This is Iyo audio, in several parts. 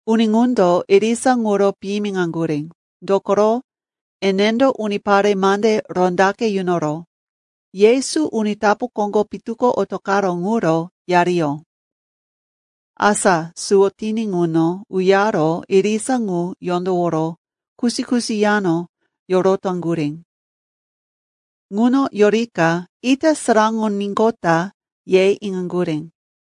Uni ŋundo irisa ŋuro piyimiŋaŋgurí, dokoro enendo unipare mande rondaqe yunoro, Yesu uni tapu koŋgo pitu ko otoqaró ŋuro yariyó. Asa suwo tiní ŋuno uyaro irisa ŋu yondoworo kusi-kusi yano yorotaŋgurí. Ŋuno yorika ita saraŋoníqota, ye iŋaŋgurí.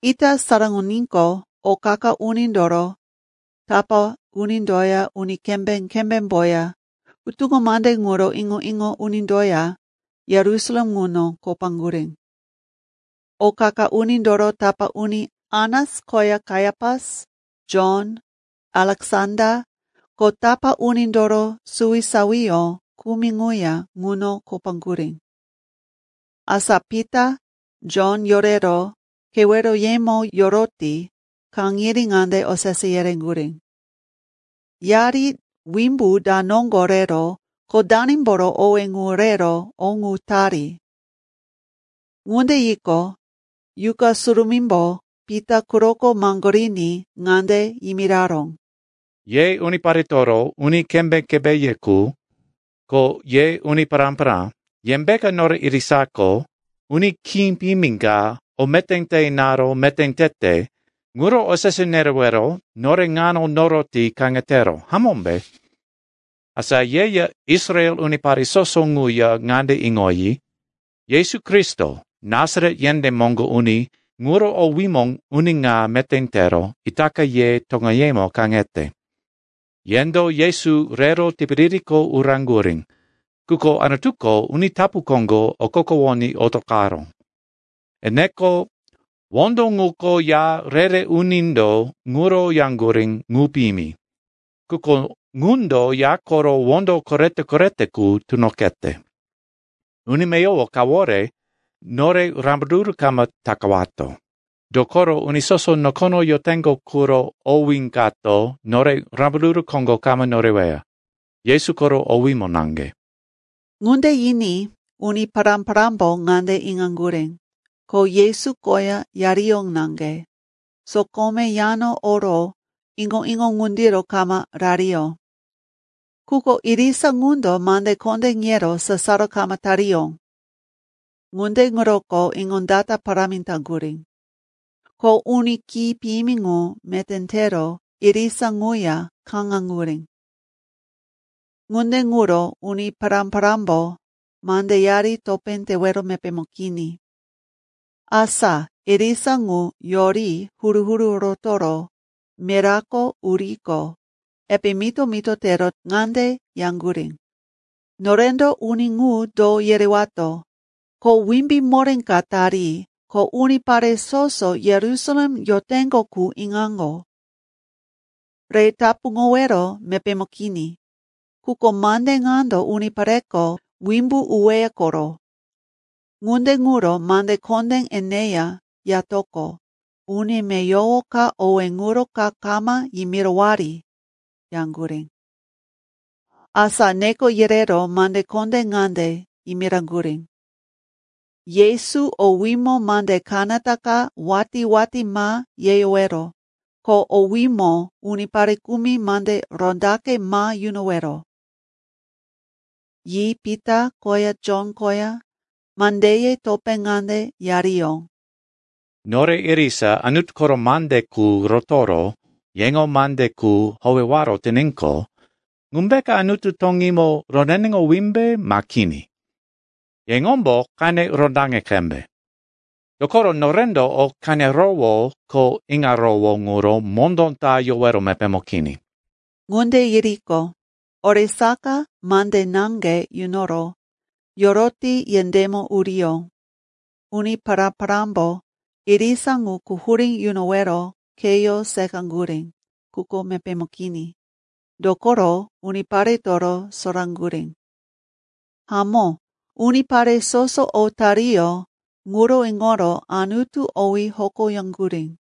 Ita saraŋoníqo, o qa-qa unindoro tapá unindoya uni kembé-kembémboya hutuŋo mande ŋuro iŋo-iŋo unindoya Yerusalem ŋuno kopaŋgurí. O qa-qa unindoro tapá uni Anas koya Kaiapas, Jon, Aleksanda ko tapá unindoro suwisawiyó kumi ŋuya ŋuno kopaŋgurí. Asa Pita, Jon yorero keweroyemo yoroti kaŋiri ŋande osese yereŋgurí, “Yari wimbu da noŋgo rero ko danimboro owé ŋu rero o ŋu tari?” Ŋunde yiqo, Yuqa Surumímbo Pita quroko maŋgoriní ŋande yimiraró, “Ye uniparetoro uni kembé-kembéye qu, ko ye uni pará-pará, yembeka nore irisako uni khí piyimi ka o meté te inaro meté tete ŋuro osese nerewero nore ŋano noroti kaŋetero, hamómbe? Asa yeya Israel unipare soso ŋuya ŋande iŋoyi, Yesu Kristo, Nasaret yendé moŋgo uni ŋuro owímo uni ŋa meté tero itaka ye toŋeyemo kaŋete. Yendo Yesu rero tipiririko uraŋgurí, quko Anutuko uni tapu koŋgo okokowoní otoqaró. Eneko “‘wondo ŋuko ya re-re unindo ŋuro yaŋgurí, “Ŋu piyimi.” Quko ŋundo ya koro wondo korete-korete qu tunoqete.’ Uni meyowo kawore nore rambaruru kama takawato. Dokoro uni soso nokono yoteŋgo quro owí kato nore rambaruru koŋgo kama noreweya. Yesu koro owímo naŋge.” Ŋunde yiní uni pará-parámbo ŋande iŋaŋgurí, ko Yesu koya yariyó naŋge, sokome yano oro iŋo-iŋo ŋundiro kama rariyó. Quko irisa ŋundo mande kondé yero sasaro kama tariyó. Ŋunde ŋuroko iŋondata parámi taŋgurí. Ko uni khí piyimi ŋu meté tero irisa ŋuya kaŋaŋgurí. Ŋunde ŋuro uni pará-parámbo mandeyari topé tewero mepémo kini. Asa irisa ŋu yori huru-huru rotoro mirako uriqo, epe mito-mito tero ŋande yaŋgurí, “Norendo uni ŋu do yerewato? Kho wimbí moré ka tari, ko unipare soso Yerusalem yoteŋgo qu iŋaŋgo. Re tapuŋowero mepémo kini. Quko mande ŋando unipareko wimbo uweya koro. Ŋunde ŋuro mande kondé eneya yatoqo, uni meyowo ka owé ŋuro ka kama yimirowari,” yaŋgurí. Asa neko yerero mande kondé ŋande yimiraŋgurí, “Yesu owímo mande kanata ka watí-watí ma yeyowero, ko owímo unipare kumi mande rondaqe ma yunowero.” Yi Pita koya Jon koya mandeye topé ŋande yariyó, “Nore irisa Anutu koro mande qu rotoro yeŋo mande qu howewaro tiníqo, ŋumbeka Anutu toŋímo roneneŋowímbe ma kini? Yeŋombo qene rondaŋi qembe. Dokoro norendo o qenerowó ko iŋarowó ŋuro mondó ta yowero mepémo kini.” Ŋunde yiriqo, oresaka mande naŋge yunoro yoroti yendémo uriyó. Uni pará-parámbo irisa ŋu quhurí yunowero kheyó seqaŋgurí, quko mepémo kini, dokoro uniparetoro soraŋgurí. Hamó, unipare soso o tariyó ŋuro iŋoro Anutu owí hokoyaŋgurí.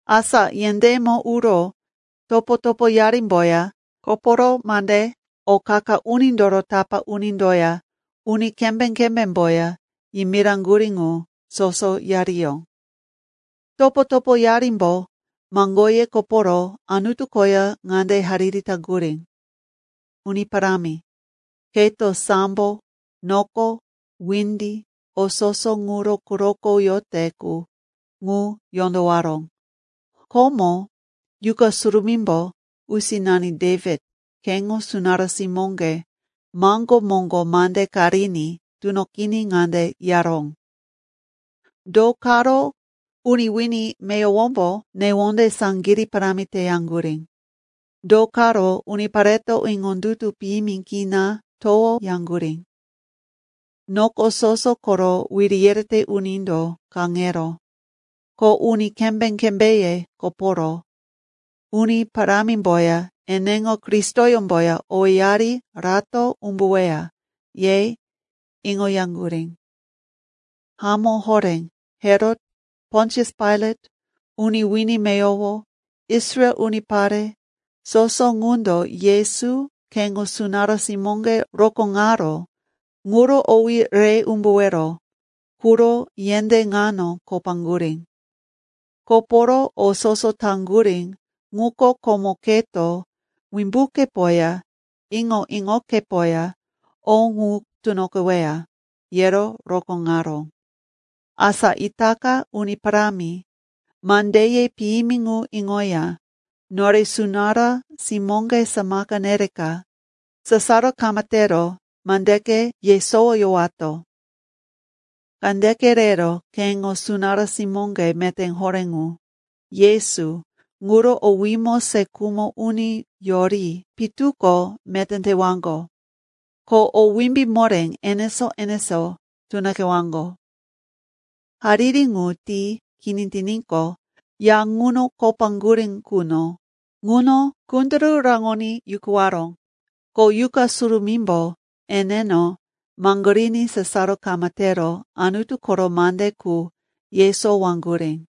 Asa yendémo uro topo-topoyarimboya koporo mande o qa-qa unindoro tapá unindoya uni kembé-kembémboya yimiraŋgurí ŋu soso yariyó. Topo-topoyarimbo maŋgoye koporo Anutu koya ŋande hariri taŋgurí, “Uni Parámi, keto sambo, noko, windi, o soso ŋuro quroko yote qu, ŋu yondowaró. Komo Yuqa Surumímbo usinani Dewit, keŋo sunará simóŋge maŋgó moŋgo mande ka riní tunoqiní ŋande yaró, “‘Do karo uni wini meyowombo newonde saŋgirí parámi teyaŋgurí? Do karo unipareto iŋondutu piyimi kina towoyaŋgurí? Noko soso koro wiri yerete unindo kaŋero, ko uni kembé-kembéye koporo, Uni Parámimboya eneŋo Kristoyómboya owéyari rato umbuweya, ye iŋoyaŋgurí.’ “Hamó horé, Herot, Pontius Pailat, uni wini meyowo, Israel unipare, soso ŋundo Yesu, keŋo sunará simóŋge rokóŋaró, ŋuro owí re umbuwero quro yendé ŋano kopaŋgurí. Koporo o soso taŋgurí ŋuko komo keto wimbukepoya iŋo-iŋokepoya o ŋu tunoqeweya, yero rokóŋaró. Asa itaka, Uni Parámi, mandeye piyimi ŋu iŋoya nore sunará simóŋge samaka nereka sasaro kama tero mandeke yesowoyowato. Kandeke rero keŋo sunará simóŋge meté horé ŋu, Yesu, ŋuro owímo se khumo uni yori pitu ko meté tewaŋgo, ko o wimbí moré enesó-enesó tunoqewaŋgo.” Hariri ŋu ti kini tiníqo, ya ŋuno kopaŋgurí quno ŋuno kunduru raŋoní yukuwaró. Ko Yuqa Surumímbo eneno maŋgoriní sasaro kama tero Anutu koro mande qu yesowaŋgurí.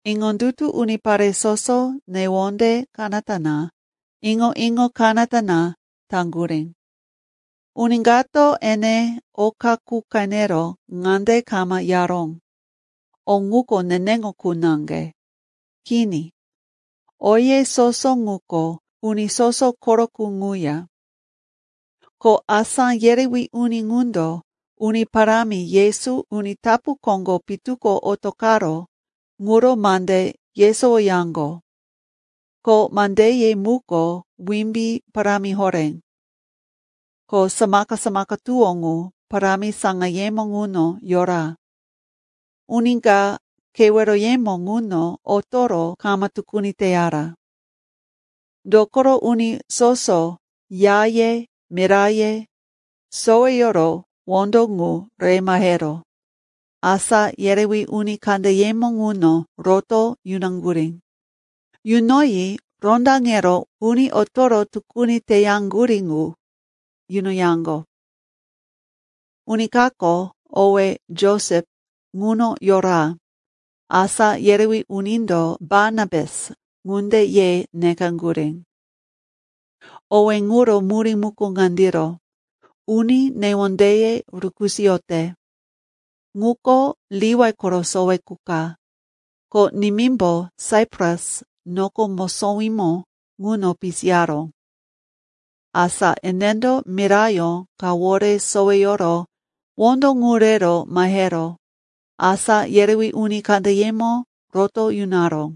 Iŋondutu unipare soso newonde kanata na, iŋo-iŋo kanata na taŋgurí. Uni kato ene oka qu qenero ŋande kama yaró, “O ŋuko neneŋo qu naŋge.” Kini, oye soso ŋuko uni soso koro qu ŋuya. Ko asá yerewí uni ŋundo Uni Parámi Yesu uni tapu koŋgo pitu ko otoqaró ŋuro mande yesowoyaŋgo, ko mandeye muko wimbí parámi horé. Ko samaka-samaka tuwó ŋu parámi saŋayemo ŋuno yora. Uni ka keweroyemo ŋuno otoro kama tukuni teyara. Dokoro uni soso yaye, miraye soweyoro wondo ŋu re mahero asá yerewí uni kandeyemo ŋuno roto yunaŋgurí. Yunoyi rondaŋero uni otoro tukuni teyaŋgurí qu yunoyaŋgo. Uni kako, owí Josep, ŋuno yora. Asá yerewí unindo, “Barnabas,” ŋunde ye nekaŋgurí. Owé ŋuro murí muko ŋandiro, “Uni newondeye rukisoyote.” Ŋuko Liwai koro sowe qu ka, ko nimímbo Saipras noko mosowímo ŋuno pisiyaró. Asa enendo mirayó kawore soweyoro wondo ŋu rero mahero asá yerewí uni kandeyemo roto yunaró.